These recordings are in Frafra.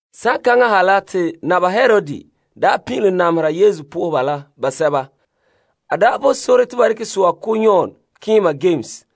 Saŋkaŋa ha la te Naba Herod daa pin'ilom namehera Yesu lagaŋɔ la nɛreba basɛba. A daa bo sore te ba dekɛ so'a ko' Yon keema Yames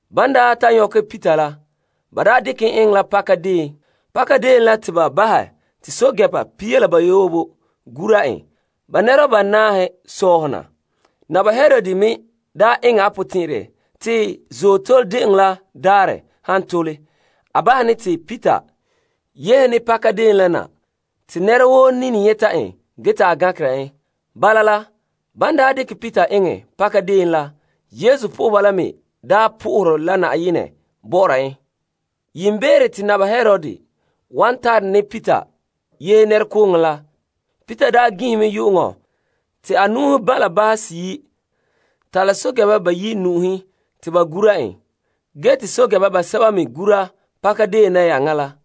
Ban ta nyɔkɛ Peter la, ba dekɛ en eŋɛ la pakadeen. Pakadeen la te ba bahɛ te pɛɛntɛɛnreba pia la bayoobe gura en ba nɛreba banaahe sɔhɔna. Naba Herod me eŋɛ a potɛn'ɛrɛ te Azootole De'eŋɔ la daarɛ han tole, a bahɛ ne te Peter yehene pakadeen la na te nɛra woo nini nyɛta en ge te a gankera en. Bala la, ban dekɛ Peter eŋɛ paka deon la, lagaŋɔ la nɛreba po'ohere la Yenɛ bɔ'ɔra en. Yiimbeere te Naba Herod wan tare ne Peter yehe nɛrekooŋɔ la, Peter daa ginhe mɛ yu'uŋɔ te a nu'uhen ba' la banhe seyi' ta' la pɛɛntɛɛnreba bayi' nu'uhen te ba gura en. Ge te pɛɛntɛɛnreba basɛba me gura pakadeen nayaŋa la.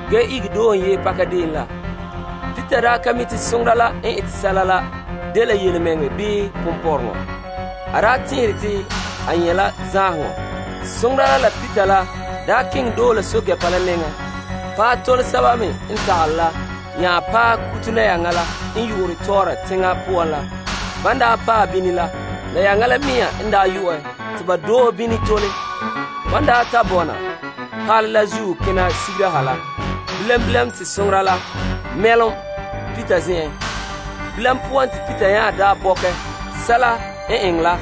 ge ihege doohe en yehe pakadeen la poan. Peter daa ka mi' te soŋora la n ete sɛla la dela yelemɛŋɛrɛ bii ponpɔrɔŋɔ. A daa tɛn'ɛre te a nyɛ' la zaanheŋɔ. Soŋora la la Peter la keŋɛ doohe la yia guruba nɛŋa tole, paɛ tole sɛba me n tagale nya paɛ kuto nayaŋa la te ba keŋ yeŋa kɛn'ɛra teŋa poan la. Ban paɛ bini la, nayaŋa la mea n daa yu'ɛ te ba doohe bini tole. Ban ta bɔna palɛ la zuo kena sigera ha la, bilam bilam te soŋora la mɛlom Peter zen'en. Peter n ta bɔkɛ sɛla n eŋɛ la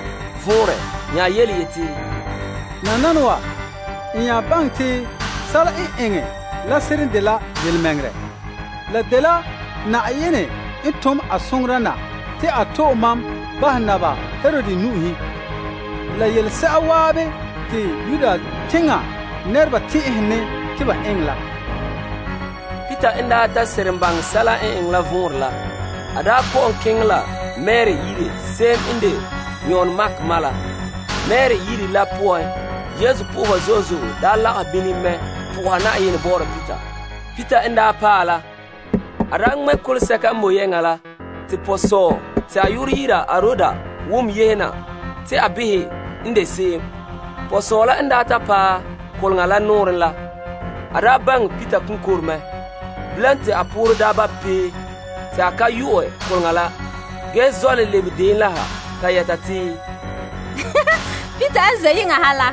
vɔnrɛ a nya yeti, Nananawa n nya baŋɛ te sɛla n eŋɛ la seren dela yelemɛŋɛrɛ. La dela Na'ayenɛ tom a soŋora na te a to'e ma bahɛ Naba Herod nu'uhen la yelese'a zan'an te Yuda teŋa nɛreba tɛn'ɛhene te ba eŋɛ la. Peter n ta seren baŋɛ sɛla n eŋɛ la vɔnrɛ la, a kɔ'ɔn keŋɛ la Mari yire se'em n de Yon Mark ma la, zen'en te Yesu nɛreba la zo'e zo'e lagahɛ bini mɛ soha Yenɛ bɔ'ɔra Peter. Peter n paɛ la, a ŋmɛ' koleŋa sɛka n boe yeŋa la te pɔsɔɔ te a yu'urɛ dɛna Aroda wom yehe na te a behɛ n de se'em. Pɔsɔɔ la n ta paɛ koleŋa la nɔɔrɛn la, a baŋɛ Peter konkore mɛ. Bilam te a poorɛ ba' pee, te a ka yu'ɛ koleŋa la ge zɔ' le lebe deon la ha ta yɛta te, Peter n ze' yeŋa ha la.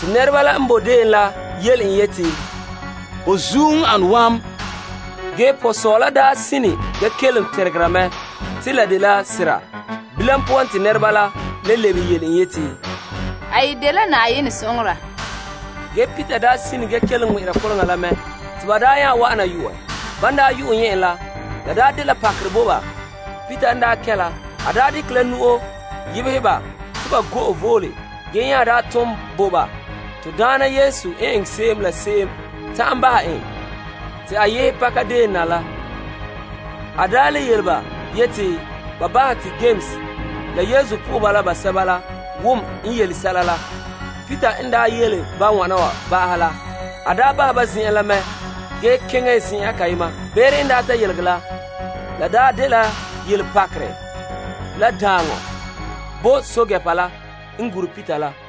Te nɛreba la n boe deon la yele en yeti, Ho zuo n ane wam! Ge pɔsɔɔ la sine ge kelom teregera mɛ te la dela sera, te nɛreba la le lebehe yeti, A yi dela Yenɛ soŋora! Ge Peter sine ge kelom ŋmɛ'ɛra koleŋa la mɛ te ba nya wa'ana yu'ɛ. Ban yu'ɛ nyɛ' en la, la de pakerɛ bo ba. Peter n kɛn' la, a dekɛ la nu'o pa'alɛ ba te ba go'e vole ge nya tun bo ba Na'ayenɛ n eŋɛ se'em la se'em ta'an bahɛ en te a yehe pakadeen na la. A le yele ba te, Bahɛ te Yames la Yesu nɛreba n wom n yele sɛla la. Ge te a nya bahɛ ba zen'en la mɛ ge keŋɛ zen'an kayema. Beere n daa ta yelegɛ la, la daa dela daaŋɔ bo pɛɛntɛɛnreba la n daa gure Peter la.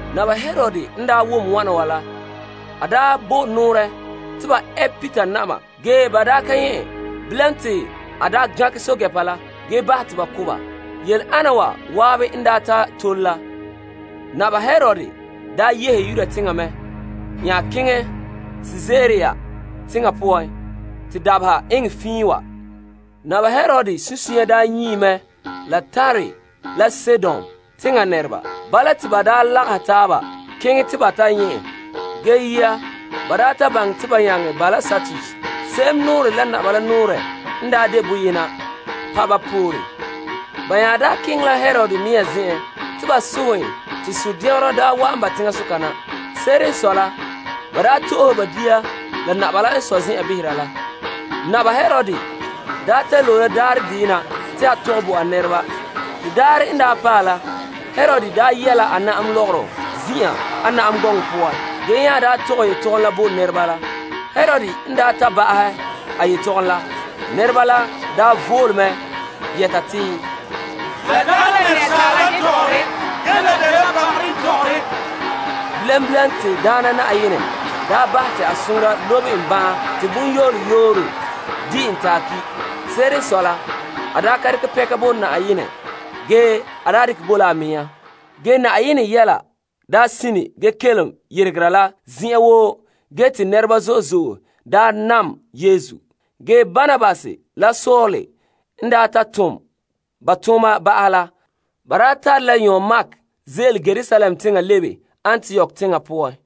Naba Herod n wom wana wa la, a bo nɔɔrɛ te ba ɛ Peter na'ma ge ba ka nyɛ' en. Bilam te a gankɛ pɛɛntɛɛnreba la ge bahɛ te ba ko' ba. Yele'ana wa zan'an n ta tole la, Naba Herod yehe Yudea teŋa mɛ nya keŋɛ Kaesarea teŋa poan te dabeha eŋɛ fiin wa. Naba Herod sunsunya daa nyii mɛ la Tire la Sidon teŋa nɛreba. Bala te ba daa lagahɛ taaba keŋɛ te ba ta nyɛ' en. Ge yia ba daa belom la Blastus te a soŋɛ ba, se'em nɔɔrɛ la Naba la nɔɔrɛ n daa de boyena pa' ba pore. Ge ba nya keŋɛ Herod zen'en te ba sohɛ en te sundɛngerɔ daa wa'an ba teŋasoka na. Se'ere n sɔe la, ba daa to'ohe ba dia la Naba la n sɔe zen'an behera la. Naba Herod daa ta loe la daarɛ deyena te a tɔgɛ bo a nɛreba. De daarɛ n daa paɛ la, Herod yɛ la a na'am lɔgɔrɔ zin'an a na'am gɔŋɔ poan ge nya tɔgɛ yetɔgom la bo nɛreba la. Herod n daa ta ba'ahɛ a yetɔgom la, nɛreba la vole mɛ yɛta te, La dagɛ la asaala n tɔgɔre ge la dela bagarɛ n tɔgɔre. Bilam bilam te Daana Na'ayenɛ soŋora ŋmɛ en bahɛ teŋa te bonyole yooro di' en te a ki'. Se'ere n sɔe la, a daa ka dekɛ pɛnka bo Yenɛ ge a dekɛ bo la a mea. Ge Yenɛ yɛla daa sine ge kelom yeregera la zen'an woo ge te nɛreba zo'e zo'e daa nam Yesu. Ge Barnabas la Saul n ta tom ba tooma ba'ahɛ la, ba tare la Yon Mark ze'ele Yerusalem teŋa lebe Antiok teŋa poan.